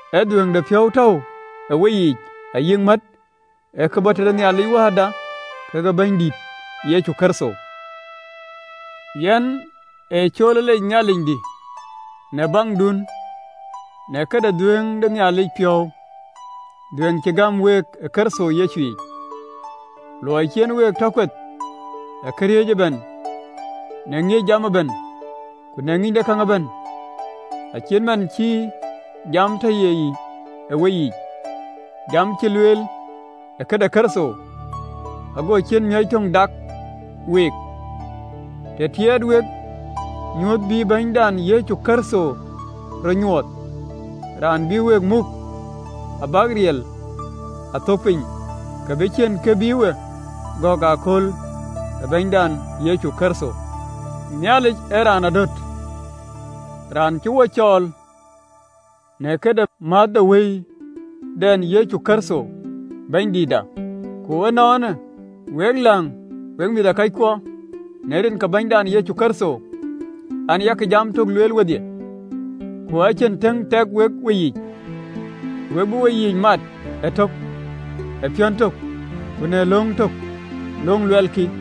Ë dhuëëŋdepiɔ̈u tɔ̈u ë weyiic ayï mät, ë ke bɔ̈ tëde Nhialic Wääda kekë Bɛ̈nydït Yecu Kërtho. Yɛn ee cool ë lec Nhialicdï në baŋdun, në këde dhuëëŋ de Nhialic piɔ̈u dhuëëŋ cï gäm week ë Kërtho Yecu yic, luɔi cï en week tɔ kueth në këriëëc ëbɛ̈n, në ŋiëc jam ëbɛ̈n ku në ŋïny de käŋ ëbɛ̈n, acït man cï jam tɔ ye yic ë weyiic jam cï lueel ë këde Kërtho: ago ciën miɔ̈c töŋ dak week, të tiɛɛt wek nyuöth bï Bɛ̈nydan Yecu Kërtho rɔt nyuɔɔth. Raan bï week muk abäk riɛl a thöökë piny, ke bï ciën kë bï we gɔ̈k ëkööl ë Bɛ̈nydan Yecu Kërtho. Nhialic ee Raan adöt, Raan cï we cɔɔl në këde määth de Wëndɛn Yecu Kërtho Bɛ̈nydïïtda. Ku ënɔɔnë, wek läŋ, wek mïthëkɔckuɔ, në rin ke Bɛ̈nydan Yecu Kërtho, an, Yak jam tök lueel wedhie, ku ë cïn tëŋ tɛk wek weyiic, ke we bï weyiic mat ëtök ë piɔ̈n tök ku në löŋ tök, löŋ luɛlkï.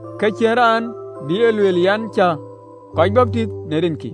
Ke cïn raan bï e lueel an, cä kɔc baptith në rinkï.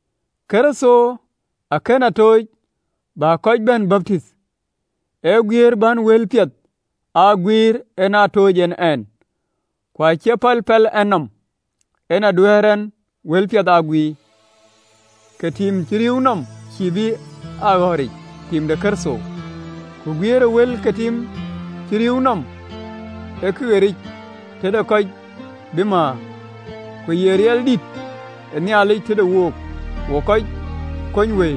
Kërtho akën a tooc, bä kɔc bɛ̈n baptith, ee guiëër bän wëlpiɛth aa guiir, en aa tooc en ɛn: ku acie pɛl pɛl ɛn nɔm en duɛ̈ɛ̈r ɛn wëlpiɛth aa guiir, ke tim cï rïïu nɔm cïï bï aa ɣɔ̈ric tim de Kërtho. Ku guiëër ë wël ke tim cï rïïu nɔm ee këɣɔ̈ric tëde kɔc bï määr, ku ye riɛldït ë Nhialic tëde wook wok kɔc kony wëi.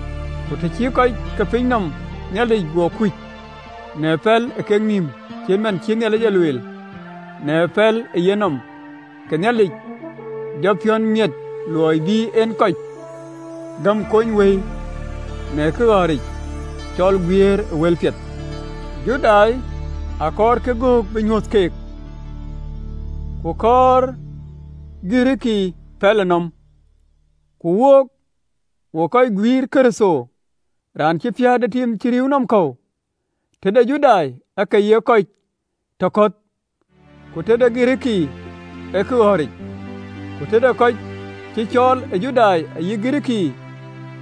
Ku të cï kɔc ke piny nɔm Nhialic guɔ kuc në pɛl ë kek nïïm, cït man cï Nhialic e lueel në pɛlënɔmde, ke Nhialic jɔ piɔ̈u miɛt luɔi bï en kɔc gäm kony wëi në këɣɔ̈ric cɔl guiëër ë wëlpiɛth. Judai akɔɔrkï gök bï nyuöth keek, ku kɔɔr Girikii pɛlënɔm: ku wook, wok guiir Kërtho, raan cï piäät ë tim cï rïïu nɔm kɔ̈u, tëde Judai, ee kë ye kɔc tɔ kɔ̈th, ku tëde Girikii ee këɣɔ̈ric, ku tëde kɔc cï cɔɔl, Judai ayï Girikii,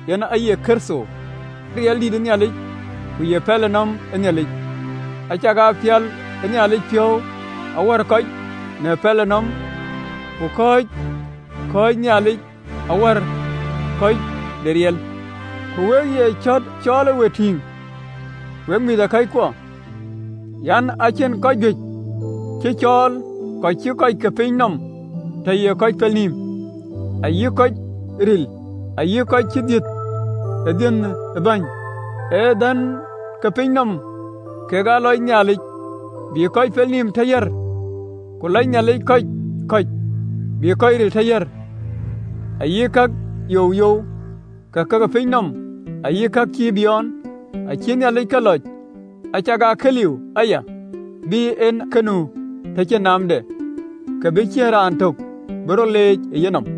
yen aye Kërtho, riɛldïït ë Nhialic, ku ye pɛlënɔm ë Nhialic. Acakaa pial ë Nhialic piɔ̈u awär kɔc në pɛlënɔm, ku kɔ̈c kɔ̈ɔ̈cë Nhialic awär kɔc në riɛl. Ku we ye cɔ̈t cɔɔlë we tïŋ, wek mïthëkɔckuɔ, an: Acïn kɔc juëc cï cɔɔl, kɔc cï kɔc ke piny nɔm tɔ ye kɔc pel nïïm ayï kɔc ril, ayï kɔc cï dhiëëth ë dhiën ë bɛ̈ny: ee dhän ke piny nɔm kek ë lɔc Nhialic, bïk kɔc pelnïïm tɔ yäär: ku lɔc Nhialic kɔc kɔ̈c, bïk kɔc ril tɔ yäär, ayï ka youyou ka ke piny nɔm, ayï ka cï biɔɔn, acï Nhialic ke lɔc, acakaa ka liu aya, bï en ka nu tɔ cïn naamden, ke bï ciën raan töŋ bï rɔt leec ë yenɔm.